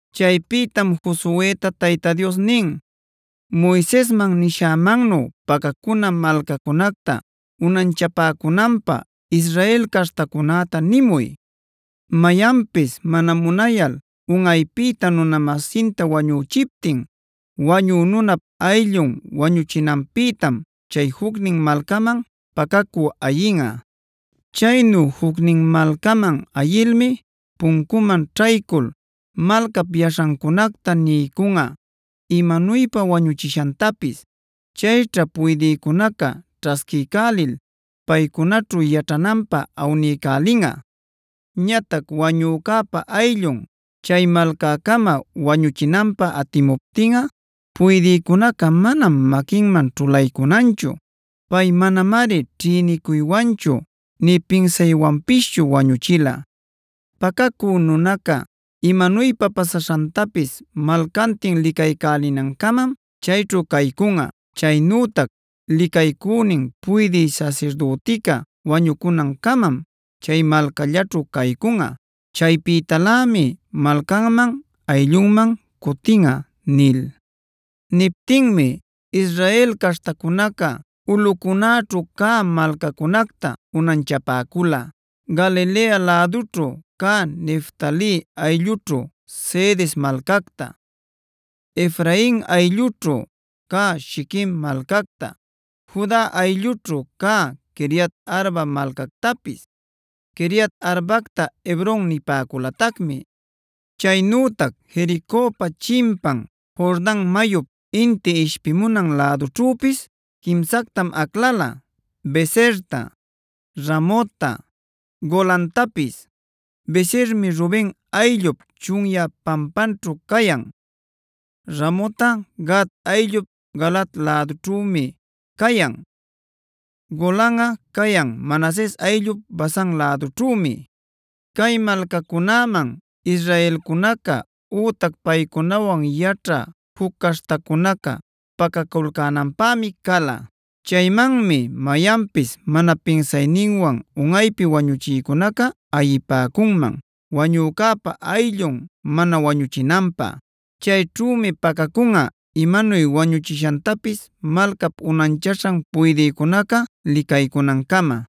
Chaypïtam Josueta Tayta Dios nin: “Moisesman nishämannu pacacuna malcacunacta unanchapäcunanpäa Israel caśhtacunäta nimuy. Mayanpis mana munayal unꞌaypïta nuna-masinta wañüchiptin wañü nunap ayllun wañuchinanpïtam chay jucnin malcaman pacacü ayinꞌa. Chaynu jucnin malcaman ayilmi puncuman ćhaycul malcap yaśhancunacta niycunꞌa imanuypa wañuchishantapis. Chayćha puydïcunaca ćhasquiycälil paycunaćhu yaćhananpä awniycälinꞌa. Ñatac wañücäpa ayllun chay malcäcama wañuchinanpä atimuptinꞌa puydïcunaca manam maquinman ćhulaycunanchu. Pay manamari ćhïnicuyninwanchu nï pinsayninwanpischu wañuchila. Pacacü nunaca imanuypa pasaśhantapis malcantin licaycälinancamam chayćhu caycunꞌa. Chaynütac licaycünin puydï sasirdütica wañucunancamam chay malcallaćhu caycunꞌa. Chaypïtalämi malcanman ayllunman cutinꞌa” nil. Niptinmi Israel caśhtacunaca ulꞌucunäćhu cä malcacunacta unanchapäcula: Galilea lädućhu cä Neftali ayllućhu Cedes malcacta, Efrain ayllućhu cä Shiquem malcacta, Juda ayllućhu cä Quiriat-arba malcactapis (Quiriat-arbacta Hebron nipäculatacmi.) Chaynütac Jericopa chimpan Jordan mayup inti ishpimunan lädućhüpis quimsactam aclala: Beserta, Ramotta, Golantapis. Besermi Ruben ayllup chunyä pampanćhu cayan. Ramotꞌa Gad ayllup Galaad lädućhümi cayan. Golanꞌa cayan Manases ayllup Basan lädućhümi. Cay malcacunaman israelcunaca ütac paycunawan yaćhä juc caśhtacunaca pacaculcänanpämi cala. Chaymanmi mayanpis mana pinsayninwan unꞌaypi wañuchïcunaca ayipäcunman, wañücäpa ayllun mana wañuchinanpä. Chayćhümi pacacunꞌa imanuy wañuchishantapis malcap unanchaśhan puydïcunaca licaycunancama.